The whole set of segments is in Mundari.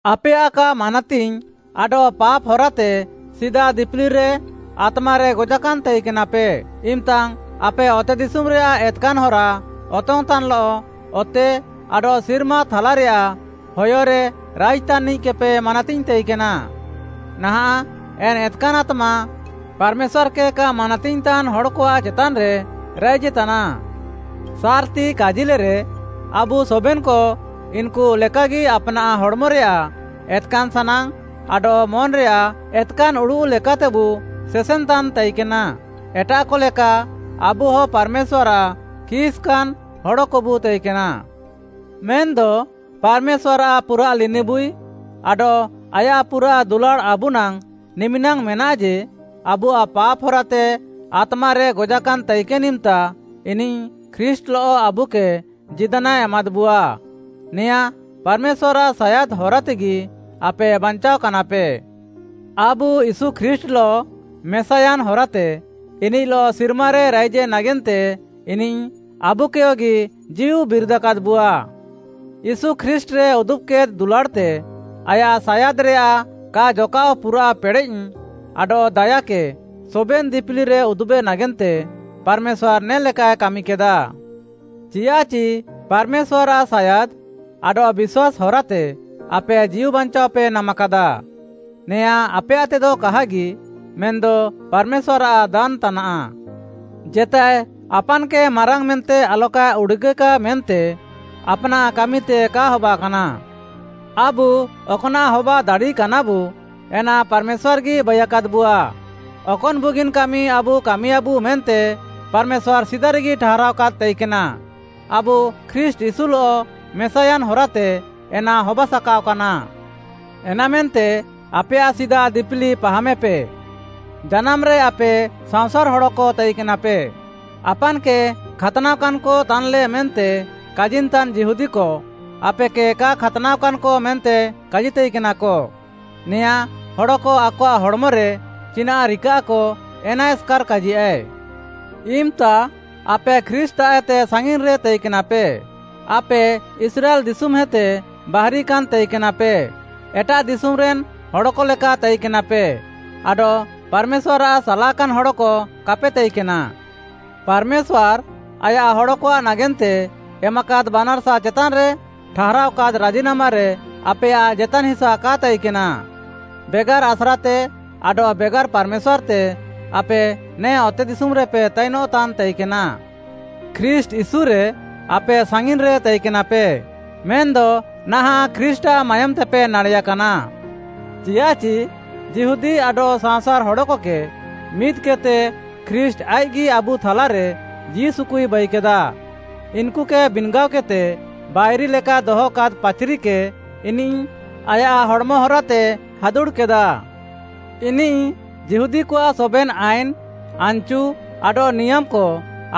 ଆପେୟାଃ କା ମାନାତିଙ୍ଗ୍‌ ଆଡଃ ପାପ୍‌ ହରାତେ ସିଦା ଦିପିଲିରେ ଆତ୍ମାରେ ଗଜାକାନ୍‌ପେ ତାଇକେନା, ଇମ୍‌ତାଙ୍ଗ୍‌ ଆପେ ଅତେଦିଶୁମ୍‌ରେୟାଃ ଏତ୍‌କାନ୍‌ ହରା ଅତଙ୍ଗ୍‌ତାନ୍‌ଲଃ, ଅତେ ଆଡଃ ସିର୍ମା ଥାଲାରେୟାଃ ହୟରେ ରାଇଜ୍‌ ତାନ୍‌ନିଃକେପେ ମାନାତିଙ୍ଗ୍‌ ତାଇକେନା। ନାହାଁଃ ଏନ୍‌ ଏତ୍‌କାନ୍‌ ଆତ୍ମା, ପାର୍‌ମେଶ୍ୱାର୍‌କେ କା ମାନାତିଙ୍ଗ୍‌ତାନ୍‌ ହଡ଼କଆଃ ଚେତାନ୍‌ରେ ରାଇଜେତାନା। ସାର୍‌ତି କାଜିଲେରେ, ଆବୁ ସବେନ୍‌କ ଇନ୍‌କୁ ଲେକାଗି ଆପ୍‌ନାଃ ହଡ଼୍‌ମରେୟାଃ ଏତ୍‌କାନ୍‌ ସାନାଙ୍ଗ୍‌ ଆଡଃ ମନ୍‌ରେୟାଃ ଏତ୍‌କାନ୍‌ ଉଡ଼ୁଃ ଲେକାତେବୁ ସେସେନ୍‌ତାନ୍‌ ତାଇକେନା, ଏଟାଃକ ଲେକା ଆବୁହ ପାର୍‌ମେଶ୍ୱାର୍‌ଆଃ ଖିସ୍‌କାନ୍‌ ହଡ଼କବୁ ତାଇକେନା। ମେନ୍‌ଦ ପାର୍‌ମେଶ୍ୱାର୍‌ଆଃ ପୁରାଃ ଲିନିବୁଇ ଆଡଃ ଆୟାଃ ପୁରାଃ ଦୁଲାଡ଼୍‌ ଆବୁନାଙ୍ଗ୍‌ ନିମିନାଙ୍ଗ୍‌ ମେନାଃ ଯେ, ଆବୁଆଃ ପାପ୍‌ ହରାତେ ଆତ୍ମାରେ ଗଜାକାନ୍‌ ତାଇକେନ୍‌ ଇମ୍‌ତା, ଇନିଃ ଖ୍ରୀଷ୍ଟ୍‌ଲଃ ଆବୁକେ ଜୀଦାନାଏ ଏମାଦ୍‌ବୁଆ। ନେଆଁଁ ପାର୍‌ମେଶ୍ୱାର୍‌ଆଃ ସାୟାଦ୍‌ ହରାତେଗି ଆପେ ବାଞ୍ଚାଅକାନାପେ। ଆବୁ ୟୀଶୁ ଖ୍ରୀଷ୍ଟ୍‌ଲଃ ମେସାୟାନ୍‌ ହରାତେ ଇନିଃଲଃ ସିର୍ମାରେ ରାଇଜେ ନାଗେନ୍ତେ ଇନିଃ ଆବୁକେୟଗି ଜୀଉ ବିରିଦାକାଦ୍‌ବୁଆ। ୟୀଶୁ ଖ୍ରୀଷ୍ଟ୍‌ରେ ଉଦୁବ୍‌କେଦ୍‌ ଦୁଲାଡ଼୍‌ତେ ଆୟାଃ ସାୟାଦ୍‌ରେୟାଃ କା ଜକାଃଅ ପୁରାଃ ପେଡ଼େଃ ଆଡଃ ଦାୟାକେ ସବେନ୍‌ ଦିପିଲିରେ ଉଦୁବେ ନାଗେନ୍ତେ ପାର୍‌ମେଶ୍ୱାର୍‌ ନେ ଲେକାଏ କାମିକେଦା। ଚିୟାଃଚି ପାର୍‌ମେଶ୍ୱାର୍‌ଆଃ ସାୟାଦ୍‌ ଆଡଃ ବିଶ୍ୱାସ୍‌ ହରାତେ ଆପେ ଜୀଉବାଞ୍ଚାଅପେ ନାମାକାଦା। ନେଆଁଁ ଆପେୟାଃତେଦ କାହାଗି, ମେନ୍‌ଦ ପାର୍‌ମେଶ୍ୱାର୍‌ଆଃ ଦାନ୍‌ ତାନାଃ। ଜେତାଏ ଆପାନ୍‌କେ ମାରାଙ୍ଗ୍‌ ମେନ୍ତେ ଆଲକାଏ ଉଡ଼ୁଗେ ମେନ୍ତେ ଆପ୍‌ନାଃ କାମିତେ କା ହବାକାନା। ଆବୁ ଅକ୍‌ନାଃ ହବା ଦାଡ଼ିକାନାବୁ, ଏନା ପାର୍‌ମେଶ୍ୱାର୍‌ଗି ବାଇୟାକାଦ୍‌ବୁଆ, ଅକନ୍‌ ବୁଗିନ୍‌ କାମି ଆବୁ କାମିୟାଁବୁ ମେନ୍ତେ ପାର୍‌ମେଶ୍ୱାର୍‌ ସିଦାରେଗି ଠାହାରାଅକାଦ୍‌ ତାଇକେନା, ଆବୁ ଖ୍ରୀଷ୍ଟ୍‌ ୟୀଶୁଲଃ ମେସାୟାନ୍‌ ହରାତେ ଏନା ହବା ସାକାଅକାନା। ଏନାମେନ୍ତେ ଆପେୟାଃ ସିଦା ଦିପିଲି ପାହାମେପେ, ଜାନାମ୍‌ରେ ଆପେ ସାଅଁସାର୍‌ ହଡ଼କ ତାଇକେନାପେ। ଆପାନ୍‌କେ ଖାତ୍‌ନାଅକାନ୍‌କ ତାନ୍‌ଲେ ମେନ୍ତେ କାଜିନ୍‌ତାନ୍‌ ଯିହୁଦୀକ, ଆପେକେ କା ଖାତ୍‌ନାଅକାନ୍‌କ ମେନ୍ତେ କାଜିତାଇକେନାକ। ନେଆଁଁ, ହଡ଼କ ଆକଆଃ ହଡ଼୍‌ମରେ ଚିନାଃ ରିକାଃକ ଏନା ଏସ୍‌କାର୍‌ କାଜିୟାଃଏ। ଇମ୍‌ତା ଆପେ ଖ୍ରୀଷ୍ଟ୍‌ତାଃଏତେ ସାଙ୍ଗିନ୍‌ରେ ତାଇକେନାପେ। ଆପେ ଇସ୍ରାଏଲ୍‌ ଦିଶୁମ୍‌ହେତେ ବାହାରିକାନ୍‌ ତାଇକେନାପେ, ଏଟାଃ ଦିଶୁମ୍‌ରେନ୍‌ ହଡ଼କ ଲେକା ତାଇକେନାପେ ଆଡଃ ପାର୍‌ମେଶ୍ୱାର୍‌ଆଃ ସାଲାକାନ୍‌ ହଡ଼କ କାପେ ତାଇକେନା। ପାର୍‌ମେଶ୍ୱାର୍‌ ଆୟାଃ ହଡ଼କଆଃ ନାଗେନ୍ତେ ଏମାକାଦ୍‌ ବାନାର୍‌ସା ଚେତାନ୍‌ରେ ଠାହାରାଅକାଦ୍‌ ରାଜିନାମାରେ ଆପେୟାଃ ଜେତାନ୍‌ ହିସା କା ତାଇକେନା। ବେଗାର୍‌ ଆସ୍ରାତେ ଆଡଃ ବେଗାର୍‌ ପାର୍‌ମେଶ୍ୱାର୍‌ତେ ଆପେ ନେ ଅତେଦିଶୁମ୍‌ରେପେ ତାଇନଃତାନ୍‌ ତାଇକେନା। ଖ୍ରୀଷ୍ଟ୍‌ ୟୀଶୁରେ ଆପେ ସାଙ୍ଗିନ୍‌ରେ ତାଇକେନାପେ, ମେନ୍‌ଦ ନାହାଁଃ ଖ୍ରୀଷ୍ଟ୍‌ଆଃ ମାୟୋମ୍‌ତେପେ ନାଡ଼େୟାକାନା। ଚିୟାଃଚି ଯିହୁଦୀ ଆଡଃ ସାଅଁସାର୍‌ ହଡ଼କକେ ମିଦ୍‌କେଦ୍‌ତେ ଖ୍ରୀଷ୍ଟ୍‌ ଆଇଃକ୍‌ଗି ଆବୁ ଥାଲାରେ ଜୀଉସୁକୁଇ ବାଇକେଦା। ଇନ୍‌କୁକେ ବିନ୍‌ଗାଅକେଦ୍‌ତେ ବାଇରି ଲେକା ଦହକାଦ୍‌ ପାଚ୍‌ରିକେ ଇନିଃ ଆୟାଃ ହଡ଼୍‌ମ ହରାତେ ହାଦୁଡ଼୍‌କେଦା। ଇନିଃ ଯିହୁଦୀକଆଃ ସବେନ୍‌ ଆଇନ୍‌, ଆନ୍‌ଚୁ ଆଡଃ ନିୟାମ୍‌କ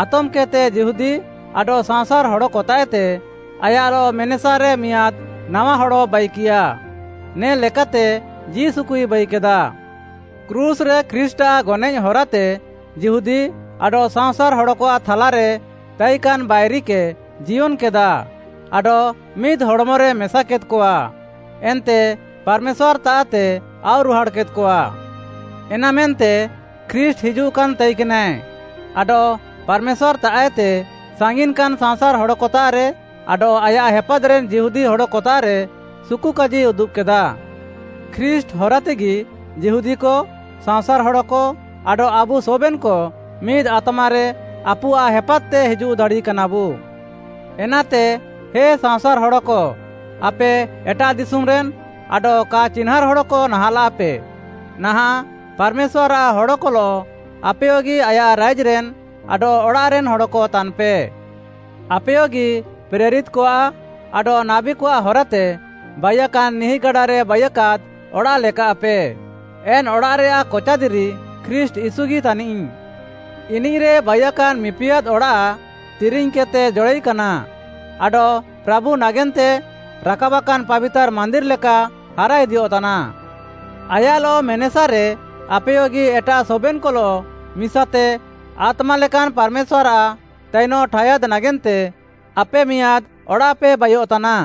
ଆତମ୍‌କେଦ୍‌ତେ ଯିହୁଦୀ ଆଡଃ ସାଅଁସାର୍‌ ହଡ଼କତାଃଏତେ ଆୟାଃଲଃ ମେନେସାରେ ମିଆଁଦ୍‌ ନାୱା ହଡ଼ ବାଇକିୟା, ନେ ଲେକାତେ ଜୀଉସୁକୁଇ ବାଇକେଦା। କ୍ରୁଶ୍‌ରେ ଖ୍ରୀଷ୍ଟ୍‌ଆଃ ଗନଏଃ ହରାତେ ଯିହୁଦୀ ଆଡଃ ସାଅଁସାର୍‌ ହଡ଼କଆଃ ଥାଲାରେ ତାଇକାନ୍‌ ବାଇରିକେ ଜିୟନ୍‌କେଦା ଆଡଃ ମିଦ୍‌ ହଡ଼୍‌ମରେ ମେସାକେଦ୍‌କଆ, ଏନ୍ତେ ପାର୍‌ମେଶ୍ୱାର୍‌ତାଃତେ ଆଉରୁହାଡ଼୍‌କେଦ୍‌କଆ। ଏନାମେନ୍ତେ ଖ୍ରୀଷ୍ଟ୍‌ ହିଜୁଃକାନ୍‌ ତାଇକେନାଏ ଆଡଃ ପାର୍‌ମେଶ୍ୱାର୍‌ତାଃଏତେ ସାଙ୍ଗିନ୍‌କାନ୍‌ ସାଅଁସାର୍‌ ହଡ଼କତାଃରେ ଆଡଃ ଆୟାଃ ହେପାଦ୍‌ରେନ୍‌ ଯିହୁଦୀ ହଡ଼କତାଃରେ ସୁକୁକାଜି ଉଦୁବ୍‌କେଦା। ଖ୍ରୀଷ୍ଟ୍‌ ହରାତେଗି ଯିହୁଦୀକ, ସାଅଁସାର୍‌ ହଡ଼କ ଆଡଃ ଆବୁ ସବେନ୍‌କ ମିଦ୍‌ ଆତ୍ମାରେ ଆପୁଆଃ ହେପାଦ୍‌ତେ ହିଜୁଃ ଦାଡ଼ିକାନାବୁ। ଏନାତେ ହେ ସାଅଁସାର୍‌ ହଡ଼କ, ଆପେ ଏଟାଃ ଦିଶୁମ୍‌ରେନ୍‌ ଆଡଃ କା ଚିହ୍ନାଁର୍‌ ହଡ଼କ ନାହାଁଃଲାପେ, ନାହାଁଃ ପାର୍‌ମେଶ୍ୱାର୍‌ଆଃ ହଡ଼କଲଃ ଆପେୟଗି ଆୟାଃ ରାଇଜ୍‌ରେନ୍‌ ଆଡଃ ଅଡ଼ାଃରେନ୍‌ ହଡ଼କ ତାନ୍‌ପେ। ଆପେୟଗି ପ୍ରେରିତ୍‌କଆଃ ଆଡଃ ନାବୀକଆଃ ହରାତେ ବାଇୟାକାନ୍‌ ନିହିଁଗାଡାରେ ବାଇୟାକାଦ୍‌ ଅଡ଼ାଃ ଲେକାଃପେ। ଏନ୍‌ ଅଡ଼ାଃରେୟାଃ କଚା ଦିରି ଖ୍ରୀଷ୍ଟ୍‌ ୟୀଶୁଗି ତାନିଃ। ଇନିଃରେ ବାଇକାନ୍‌ ମିପିଆଦ୍‌ ଅଡ଼ାଃ ତିରିଙ୍ଗ୍‌କେଦ୍‌ତେ ଜଡ଼ାଇକାନା ଆଡଃ ପ୍ରାଭୁ ନାଗେନ୍ତେ ରାକାବାକାନ୍‌ ପାବିତାର୍‌ ମାନ୍ଦିର୍‌ ଲେକା ହାରାଇଦିୟଃତାନା। ଆୟାଃଲଃ ମେନେସାରେ ଆପେୟଗି ଏଟାଃ ସବେନ୍‌କଲଃ ମିସାତେ ଆତ୍ମା ଲେକାନ୍‌ ପାର୍‌ମେଶ୍ୱାର୍‌ଆଃ ତାଇନଃ ଠାୟାଦ୍‌ ନାଗେନ୍ତେ ଆପେ ମିଆଁଦ୍‌ ଅଡ଼ାଃପେ ବାଇୟଃତାନା।